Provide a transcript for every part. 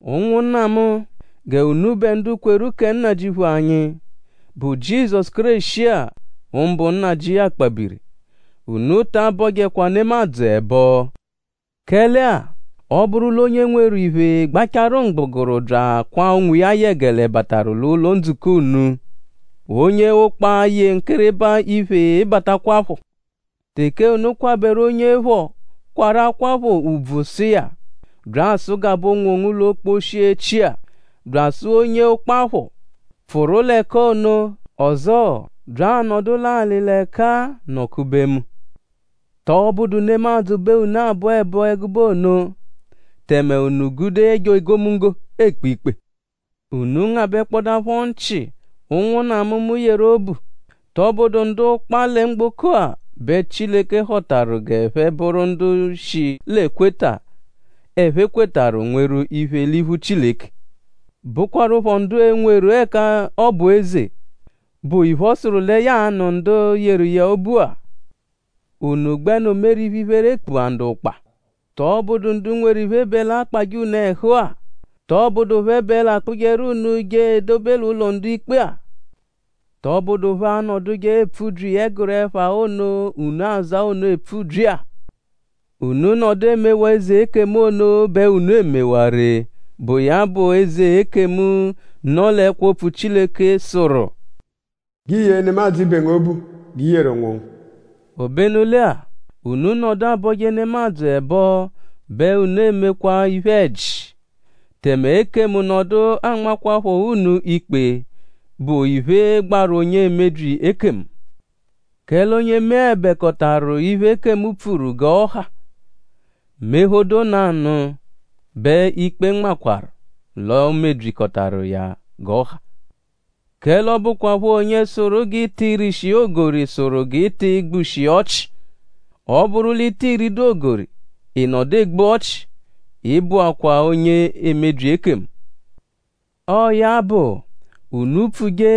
Ụnwunna mu; g'unubẹ ndu kweru kẹ Nnajịuphu anyi, bụ Jizọsu Kéreshi-a; mbụ Nnajị akpabiri; unu ta abọjekwa nemadzụ ẹbo. Kẹle-a; ọ -bụru l'onye nweru iphe gbacharu mgbụguru bya akwaa onwiya yẹgele bataru l'ụlo-ndzukọ unu; onye ụkpa -yee nwankịriba iphe batakwaphọ; teke unu kwabẹru onye phọ, kwarụ akwaphọ ùbvù sụ iya: “Bya asụgabe onwongu l'okposhi-echi-a” bya asụ onye ụkpa phọ: “Pfụru l'ẹka ono” ọzoo: “Bya anọdu l'alị l'ẹka-a nọ-kube mu”; ?tọ bụdu nemadzụ bẹ unu abọ ẹbo ẹgube ono; tẹme unu gude ẹjo egomunggo ekpe ikpe? Unu ngabẹkpodapho nchị; ụnwunna mu, mu yeru obu.?Tọ bụdu ndu ụkpa lẹ mgboko-a bẹ Chileke họtaru g'ẹphe bụru ndu shi l'ekweta, ẹphe kwetarụ nweru iphe l'iphu Chileke; bụkwarupho ndu e-nweru ẹka ọ bụ eze, bụ iphe, ọ sụru lẹ ya a-nụ ndu yeru iya obu-a. Unu gbẹnu meru iphe-iphere kpua ndu ụkpa?Tọbudu ndu nweru iphe bẹ l'akpajẹ unu ẹhu-a??Tọ bụdu phẹ bẹ l'akpụjeru unu je edobe l'ụlo ndu-ikpe-a? ?Tọbudu phẹ anọduje epfubyi ẹguru ẹpha ono, unu aza ono epfubyi-a? Unu -nọdu emewaa eze ekemu ono bẹ unu emewaa ree, bụ iya bụ eze ekemu, nọ l'ẹkwo Opfu Chileke, sụru: “G'i yee nemadzụ ibe ngu obu g'i yeru onwongu.” Obenu lẹ-a; unu -nọdu abọje nemadzụ ẹbo bẹ unu emekwa iphe-ẹji; tẹme ekemu nọdu anmakwaphọ unu ikpe, bụ iphe, gbaru onye emebyi ekemu. Kẹle onye meẹbekotaru iphe, ekemu pfuru g'ọ ha; mephodo nanụ bẹ ikpe nmakwaru l'o mebyikọtaru iya g'ọ ha. Kẹle ọ bụkwapho onye sụru g'i ti rishi ogori sụru g'i ti gbushi ọchi. Ọ -bụru l'i ti ridu ogori; ị nọdu egbu ọchi; ị bụakwaa onye emebyi ekemu. Ọo ya bụ; unu pfuje;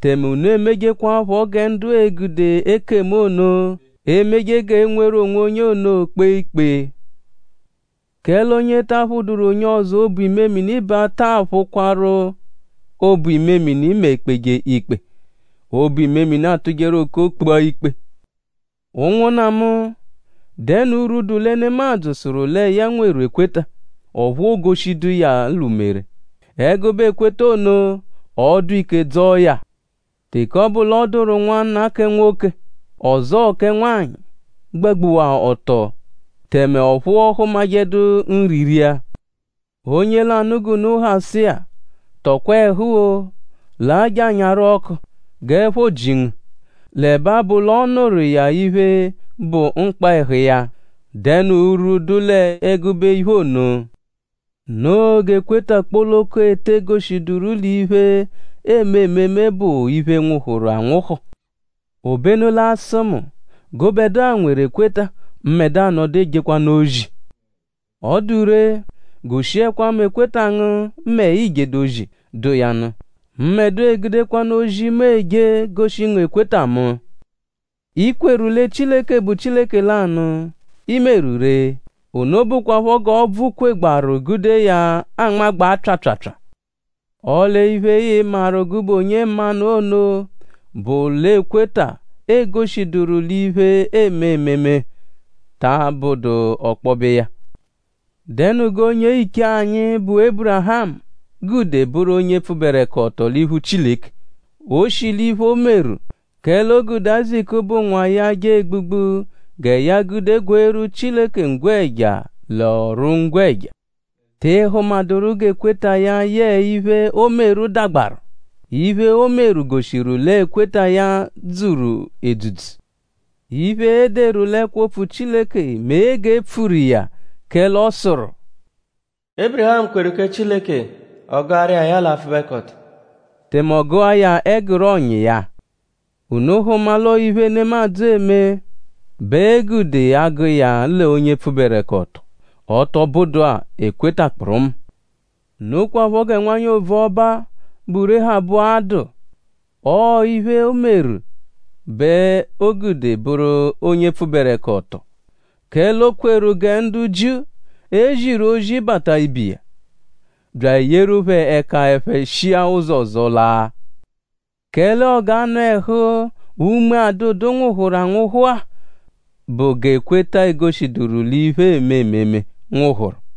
tẹme unu emejekwaphọ gẹ ndu ee-gude ekemu ono, emeje g'e nweru onwonye ono kpee ikpe. Kẹle onye ta aphụduru onye ọzo obu-imemini bẹ a taa phụkwarupho obu-imemini mẹ e -kpeje ikpe. Obu-imemini atụjeru okoo kpua ikpe! Ụnwunna mu;?dẹnu urwu, dụ lẹ nemadzụ sụru lẹ ya nweru ekweta; ọphu oogoshidu iya l'umere? Ẹgube ekweta ono?ọo-dụ ike dzọo ya? Teke ọ bụ l'ọ dụru nwanna kẹ nwoke; ọzoo kẹ nwanyị, gbagbuwa ọto; tẹme ọphu ọ hụmajedu nri ria; onye lanụ g'unu ha sụ iya: “Tọkwa ẹhu-o! Laa je anyaru ọku; g'ẹpho ji ngu” l'ẹbe abụ l'ọ nụru iya iphe, bụ mkpa ẹhu iya;?dẹnu urwu, dụ l'ẹgube iphe ono? Noo g'ekweta kpoloko e te goshiduru l'iphe, eeme ememe bụ iphe, nwụhuru anwụhu. Obenu l'a sụ mu: “Gụbedua nweru ekweta; mbẹdua nọdu ejekwanụ ozi.” Ọ dụ ree; goshiẹkwa mu ekweta ngu mẹ ii -jedu ozi, dụ iya nụ. Mbẹdua-a egudekwanu ozi, mu eje goshi ngu ekweta mu. I kweru lẹ Chileke bụ Chileke lanụ; i meru ree. Ono bụkwapho g'ọbvu kwegbaaru gude iya anmagbaa pyaapyaapyaa. Ọle iphe, ịi-maru gụbe onye mmanụ ono bụ l'ekweta, eegoshiduru l'iphe, eme ememe ta abụdu ọkpobe iya. ?Dẹnu g'onye-iche anyi, bụ Ébirihamu gude bụru onye pfụberekoto l'iphu Chileke? O shi l'iphe, o meru; kẹle o gude Áyizaku, bụ nwa iya je egbugbu gẹ ya gude gweeru Chileke ngwẹja l'ọru-ngwẹja. ?Tị hụmaduru g'ekweta iya yẹe iphe, o meru dagbaru? Iphe, o meru goshiru l'ekweta iya dzuru edzudzu. Iphe, e deru l'ẹkwo-opfu Chileke mee g'e pfuru iya; kẹle ọ sụru: “Ébirihamu kweru kẹ Chileke; ọ gụaru iya ya l'apfụbekoto”; tẹme ọ gụa ya ẹguru ọ̀nyà iya. Unu hụma l'ọo iphe, nemadzụ eme bẹ e gude agụ iya l'onye pfụberekoto; ọ tọ bụdu-a ekweta kpụrumu. Nokwaphọ gẹ nwanyị ovuọba-a, bụ Réhabu-a dụ. Ọo iphe, o meru bẹ o gude bụru onye pfụberekoto; kẹle o kweru gẹ ndu Jiu, e ziru ozi bata ibe iya; bya eyeru phẹ ẹka; ẹphe shia ụzo ọzo laa. Kẹle ọo g'anụ-ẹhu, unme adụdu nwụhuru anwụhu-a bụ g'ekweta, egoshiduru l'iphe, eeme ememe nwụhuru.